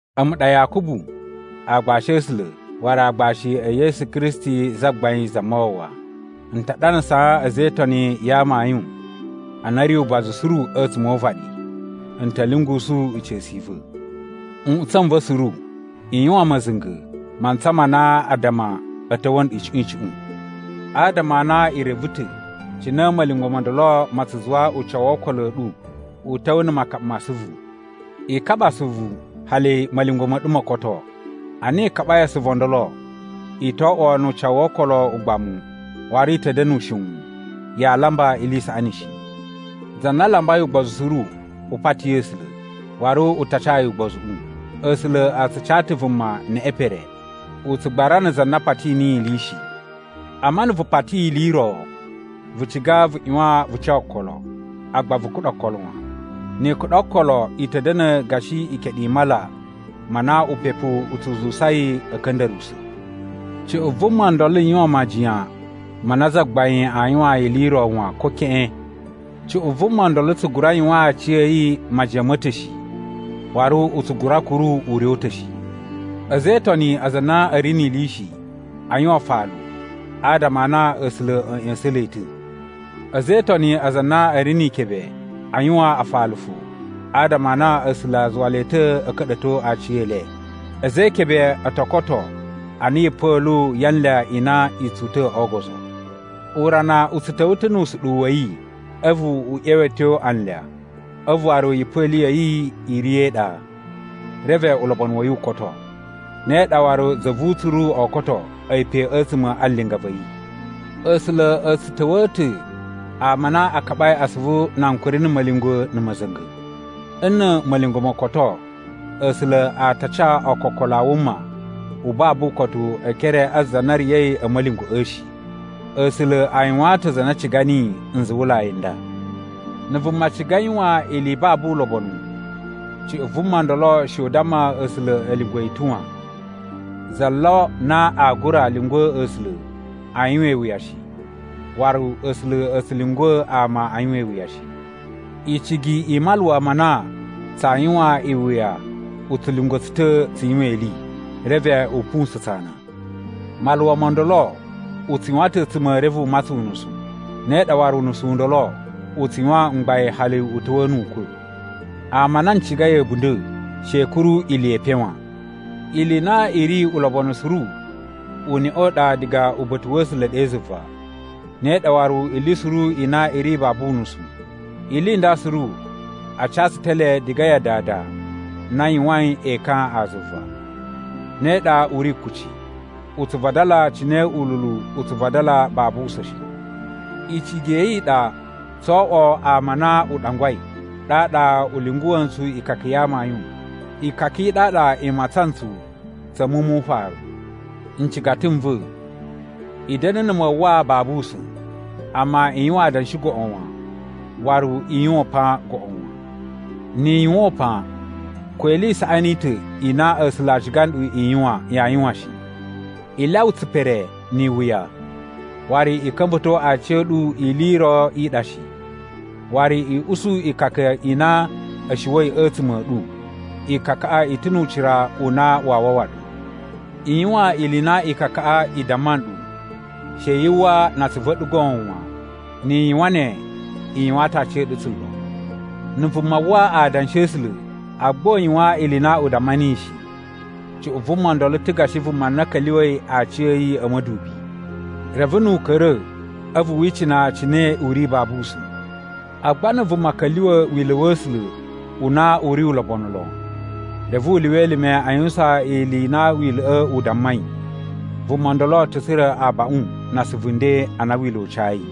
A̱mu ɗa Yakubu, aagbashi a̱ A̱sula̱ waru aagbashi e Yesu Kristi Zagbain Zamawawa. N ta ɗanasaa a̱za̱ e Itoni ya amayun a na a̱ ri ubazu suru a̱tsuma̱ o uvaɗi. N ta̱ lyungusu ica̱su i va̱. Nꞌutsa̱ n va̱ suru, i yuwan ma̱za̱nga̱ mantsa ma na addama a̱ ta̱wa̱ nɗu icuꞌun icuꞌun. Adama a na i reve ta̱ cine ma̱lyungwa̱ mo ndolo ma tsu zuwa ucawu wo okolo a̱ ɗu u ta̱wa̱ na̱ makaɓa ma asuvu. I kaɓa asuvu hali ma̱lyungwa̱ ma̱ ɗu mo koto. Ana i kaɓai asuvu o ndolo i to oꞌwo nu ucawu wo okolo ugbamu waru i ta̱ da̱na̱ ushiwun, yaa lamba ili i saꞌani shi. Za na lambai ugbozu suru, u pati A̱sula̱, waru u ta ca yi ugbozuꞌu. A̱sula̱ a tsu ca ta̱ vuma neꞌe pere. U tsu gbarana za na pati niyi ili shi. Amma na̱ vu pati ili i ro, vu ciga vu ꞌyuwan vu ca okolo, agba vu kuɗa okolo wan. Ni i kuɗa okolo i ta̱ da̱na̱ gashi ikeɗu i mala ma na upepu u tsu zuwusa yi a̱ ka̱nda̱ruwusa̱. Cuꞌun vuma ndolo yuwan majiyan ma na Zagbain aa yuwaan yi ili ro wan, ko keꞌen. Cuꞌun vuma ndolo tsu gura yuwaan aciya̱yi majiyan ma̱ ta̱ shi, waru u tsu gura kuru ure u ta̱ shi. A̱za̱ e Itoni aza a na a̱ ri ni ili shi, a yuwan afalu adama a na A̱sula̱ a̱ ꞌya̱sa̱n le ta̱. A̱za̱ e Itoni aza a na a̱ ri ni ikebe, a yuwan afalu fo adama a na A̱sula̱ a zuwa le ta̱ a̱ ka̱ɗa̱to aciyele. A̱za̱ e ikebe o to koto ana yipa̱lu ya anlya i na i tsu uta̱ o ogozo. Urana u tsu ta̱wa̱ ta̱ nu usuɗuwu wa̱ yi, a̱vu u ꞌyeweto anlya, a̱vu waru yipa̱lu ya̱ yi i riya̱ e iɗa, reve ulobonu wa̱ yi u koto. Ne ɗa waru za vu utsuru oo koto a̱yi pe a̱tsuma̱ a linga va̱ yi. A̱sula̱ a̱ tsu ta̱wa̱a̱ ta̱ ama a na a kaɓai asuvu na ankuri na̱ ma̱lyungwa̱ na̱ ma̱za̱nga̱. Nna̱ ma̱lyungwa̱ mo koto, A̱sula̱ a ta ca ookokolo a wuma u babu ukotu e ekere a za na riya̱i a̱ ma̱lyungwa̱ꞌa̱ shi. A̱sula̱ a yuwaan ta̱ aza a na a ciga niyi nzuwulai n nda. Na̱ vuma ciga yuwan ili i babu ulobonu, cuꞌun vuma ndolo she u damma A̱sula̱ a̱ lyungwa̱ yi ta̱ wan. Za lo na aa gura lyungwa̱ A̱sula̱ a yuwan iwuya shi, waru A̱sula̱ a̱ tsu lyungwa̱ ama a yuwan iwuya shi. Icigi i maluwa ma na tsaa yuwan iwuya u tsu lyungwa̱ tsu ta̱ tsu yuwan ili, reve u pusa̱n tsu ana. Maluwa mo ndolo u tsu yuwan ta̱ a̱a̱tsuma̱ reve u matsan unusu, ne ɗa waru unusu u ndolo u tsu yuwan mgbain hali u ta̱wa̱a̱ nu ukwa̱. Ama a na n cigai a̱bunda̱, she i kuru ili ye epen wan. Ili i na i ri ulobonu suru uneꞌe u ɗa diga uba̱ta̱ wa̱ A̱sula̱ ɗe zuva, ne ɗa waru ili suru i na i ri babu unusu. Ili i nda suru a ca tsu ta̱ le diga ya Dada na yuwain ekan a zuva. Ne ɗa u ri kuci, u tsu vadala cine ululu u tsu vadala babu usa̱n shi. Icigi ya̱ yi i ɗa tsoo oꞌwo ama a na u ɗangwai, ɗaɗa u lyunguwa̱ ntsu ikaka ya amayun, ikaka i ɗaɗa i matsan ntsu tsa̱ muwun mu ufaru. Ncigata n va̱, i da̱na̱ na̱ mawwa babu usa̱n, amma i yuwan adanshi goꞌo wan, waru i yuwan upan goꞌo wan. Ni i yuwan upan, ko ili i saꞌani i ta̱ i na A̱sula̱ a ciga nɗu i yuwan, yaa yuwan shi. I lyawa tsipere ni iwuya. Waru i ka̱mba̱to aciya̱ɗu ili i ro i ɗa shi, waru i usu ikaka i na a̱ shuwa̱i a̱tsuma̱ a̱ ɗu, ikakaꞌa i ta̱ nu ucira u na waa wawa ɗu. I yuwan ili i na ikakaꞌa i damma nɗu, she yu uwwa na atsuvu a̱ ɗu goon wan, ni i yuwan ne, i yuwaan ta̱ aciya̱ɗu tsulo. Na̱ vuma uwwa adanshi a̱ A̱sula̱ agba u yuwan ili i na u damma niyi shi, cuꞌun vuma ndolo ta̱ gashi vuma na ka̱lyuwa̱i aciya̱yi a̱ ma̱dubi. Reve nu u ka̱ra̱ a̱vu wi icina cine u ri babu usa̱n. Agba na̱ vuma ka̱lyuwa̱ wila̱ wa̱ A̱sula̱ u na u ri ulobonu lon, reve u lyuwa elime a yuwusan ili i na wila̱ꞌa̱ u dammai, vuma ndolo ta̱ tsura̱ abaꞌun na asuvu nden a na wila̱ u cayi.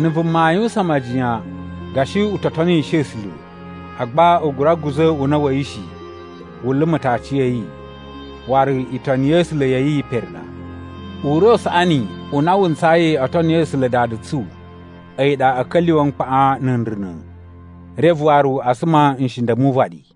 Na̱ vuma aa yuwusan majiyan gashi u to tonishi A̱sula̱, agba u gura guza̱ una̱ wa̱ yi shi, wu luma̱ ta̱ aciya̱yi, waru itoni ya̱ A̱sula̱ ya̱ yi pere ɗa. Ure u saꞌani u na wu ntsayi o toni A̱sula̱ Dada tsu a̱yi ɗa a̱ ka̱lyuwa̱ mkpaꞌan na̱ nruna̱, reve waru a suma nshinda̱ mu uvaɗi.